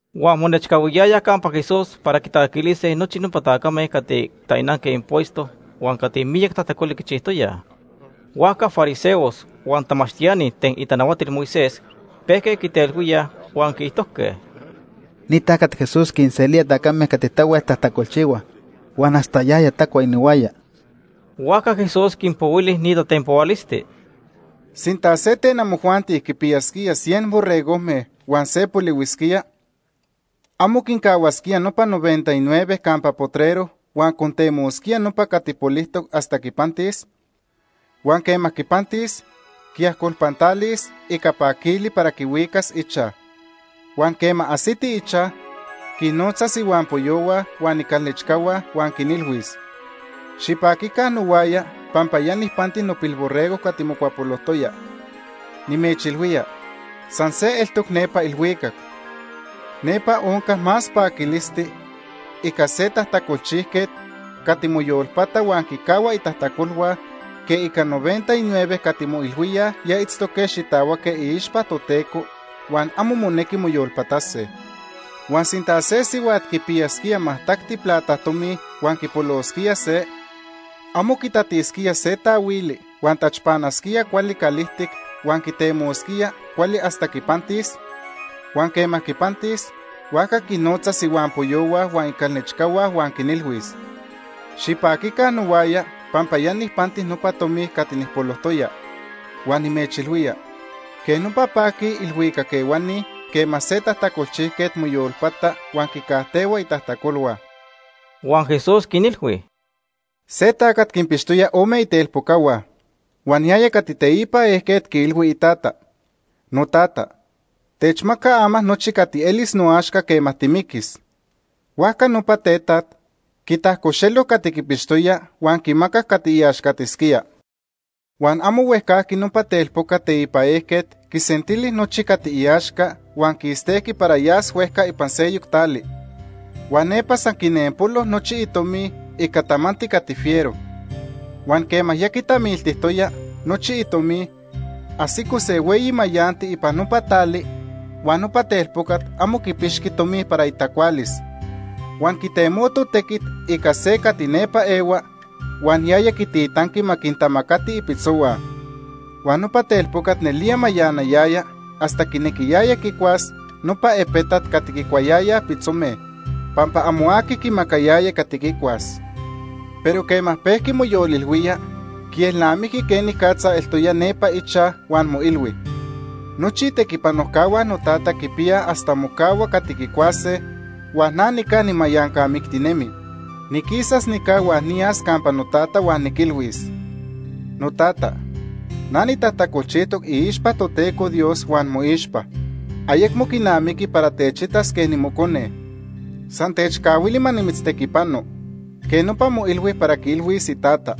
Huan monechcahuiyayaj campa Jesús para quitacaquilise nochi nopa tacame cati tainanque impuesto huan cati miyac tajtacoli quichijtoyaj. Huajca fariseos huan tamachtiani ten itanahuatil Moisés pejque quitelhuíaj huan quiijtojque: ―Ni tacat Jesús quinselía tacame cati tahuel tajtacolchihuaj, huan hasta yaya tacua inihuaya. Huajca Jesús quinpohuili ni tatenpohualisti: “Sinta se ten amojuanti quinpiyasquía cien borregojme huan se polihuisquía, ¿amo quincahuasquía nopa noventa y nueve campa potrero huan contemosquía nopa cati polijtoc hasta quipantis? Huan quema quipantis, quiajcolpantalis ica paquili para quihuicas ichaj. Huan quema ajsiti ichaj, quinnotzas ihuampoyohua huan icalnechcahua, huan quinilhuis: ‘Xipaquica nohuaya pampa ya nijpanti nopilborrego cati mocuapolojtoya.’ Nimechilhuía, san se eltoc nepa ilhuicac. Nepa onca más paquilisti ica se tajtacolchijquet cati moyolpata huan quicahua itajtacolhua, que ica noventa y nueve cati moilhuíaj ya itztoque xitahuaque iixpa Toteco, huan amo monequi moyolpatase. “Huan sinta se sihuat quipiyasquía majtacti plata tomi huan quipolosquía se, ¿amo quitatisquía se taahuili huan tachpanasquía cuali calijtic, huan quitemosquía cuali hasta quipantis? Huan quema quipantis, huajca quinnotzas ihuampoyohua huan icalnechcahua huan quinilhuis: ‘Xipaquica nohuaya pampa ya nijpanti nopa tomi cati nijpolojtoya.’ Huan nimechilhuía, quej nopa paquij ilhuicac ehuani quema se tajtacolchijquet moyolpata huan quicajtehua itajtacolhua.” Huan Jesús quinilhui: “Se tacat quinpixtoya ome itelpocahua, huan yaya cati teipan ejquet quiilhui itata: ‘Notata, techmaca ama nochi cati elis noaxca quema timiquis.’ Huajca nopa tetaj quitajcoxelo cati quipixtoya, huan quimacac cati iaxcatisquía. Huan amo huejcajqui nopa telpocat teipan ejquet quisentili nochi cati iaxca, huan quistejqui para yas huejca ipan seyoc tali. Huan nepa san quinempolo nochi itomi ica tamanti cati fiero. Huan quema ya quitamiltijtoya nochi itomi, ajsico se hueyi mayanti ipan nopa tali, huan nopa telpocat amo quipixqui tomi para itacualis. Huan quitemoto tequit ica se cati nepa ehua, huan yaya quititanqui ma quintamacati ipitzohua. Huan nopa telpocat nelía mayanayaya, hasta quinequiyaya quicuas nopa epetat cati quicuayayaj pitzome, pampa amo aqui quimacayaya cati quicuas. Pero quema pejqui moyolilhuía, quielnamijqui quenicatza eltoya nepa ichaj, huan moilhui: ‘Nochi itequipanojcahua notata quipiyaj hasta mocahua cati quicuase, huan na nica nimayancamictinemi. Niquisas nica huan niyas campa notata huan niquilhuis: Notata, na nitajtacolchijtoc iixpa Toteco Dios huan moixpa. Ayecmo quinamiqui para techitas quej nimocone. San techcahuili ma nimitztequipano. Quej nopa moilhui para quiilhuis itata.’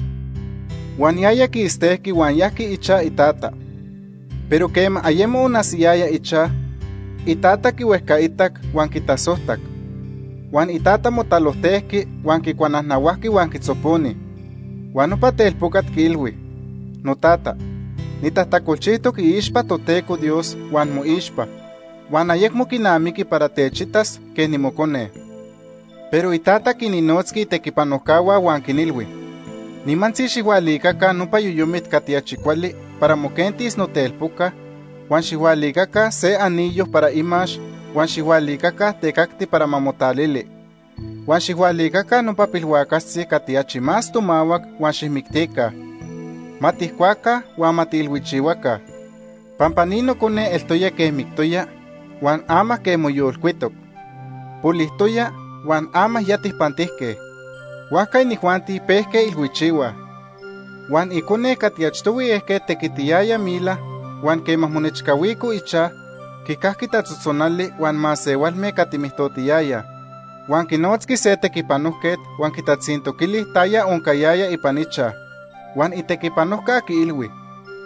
Huan yaya quistejqui huan yajqui ichaj itata. “Pero quema ayemo onajsiyaya ichaj, itata quihuejcaitac huan quitasojtac. Huan itata motalojtejqui huan quicuanajnahuajqui huan quitzoponi. Huan nopa telpocat quiilhui: ‘Notata, nitajtacolchijtoc iixpa Toteco Dios huan moixpa, huan ayecmo quinamiqui para techitas quej nimocone.’ Pero itata quinnotzqui itequipanojcahua, huan quinilhui: ‘Nimantzi, xijhualicaca nopa yoyomit cati achi cuali para moquentis notelpoca, huan xijhualicaca se anillo para imax huan xijhualicaca tecacti para ma motalili. Huan xijhualicaca nopa pilhuacaxtzi cati achi más tomahuac, huan xijmictica. Ma tijcuase huan ma tiilhuichihuase, pampa ni nocone eltoya quej mictoya, huan ama quej moyolcuitoc. Polijtoya huan ama ya tijpantijque.’ Huajca inijuanti pejque ilhuichihuaj. “Huan icone cati achtohui ejquet tequitiyaya mila, huan quema monechcahuico ichaj, quicajqui tatzotzonali huan masehualme cati mijtotiyayaj. Huan quinotzqui se tequipanojquet huan quitatzintoquili taya oncayaya ipan ichaj. Huan itequipanojca quiilhui: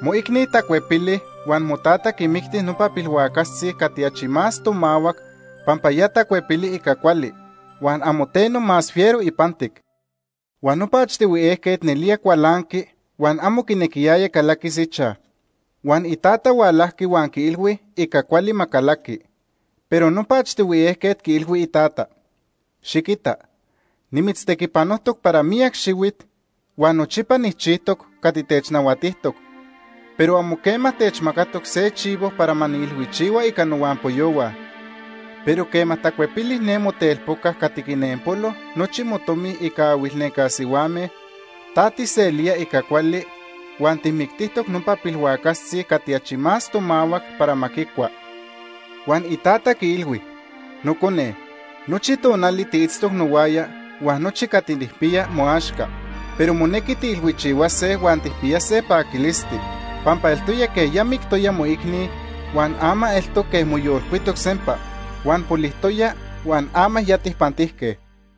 ‘Moicni tacuepili huan motata quimicti nopa pilhuacaxtzi cati achi más tomahuac pampa ya tacuepili ica cuali, huan amo teno más fiero ipantic.’ Huan nopa achtohui ejquet nelía cualanqui, huan amo quinequiyaya calaquis ichaj. Huan itata hualajqui huan quiilhui ica cuali ma calaqui. Pero nopa achtohui ejquet quiilhui itata: ‘Xiquita, nimitztequipanojtoc para miyac xihuit, huan nochipa nijchijtoc cati technahuatijtoc, pero amo quema techmacatoc se chivo para ma niilhuichihua ica nohuampoyohua. Pero quema tacuepili ne motelpoca cati quinempolo nochi motomi ica ahuilnenca sihuame, ta tijselía ica cuali, huan tijmictijtoc nopa pilhuacaxtzi cati achi tomahuac para ma quicua.’ “Huan itata quiilhui: ‘Nocone, nochi tonali tiitztoc nohuaya huan nochi cati nijpiya moaxca. Pero monequi tiilhuichihuase huan tijpiyase paquilisti, pampa eltoya quej ya mictoya moicni, huan ama eltoc quej moyolcuitoc sempa, huan polijtoya huan ama ya tijpantijque.’”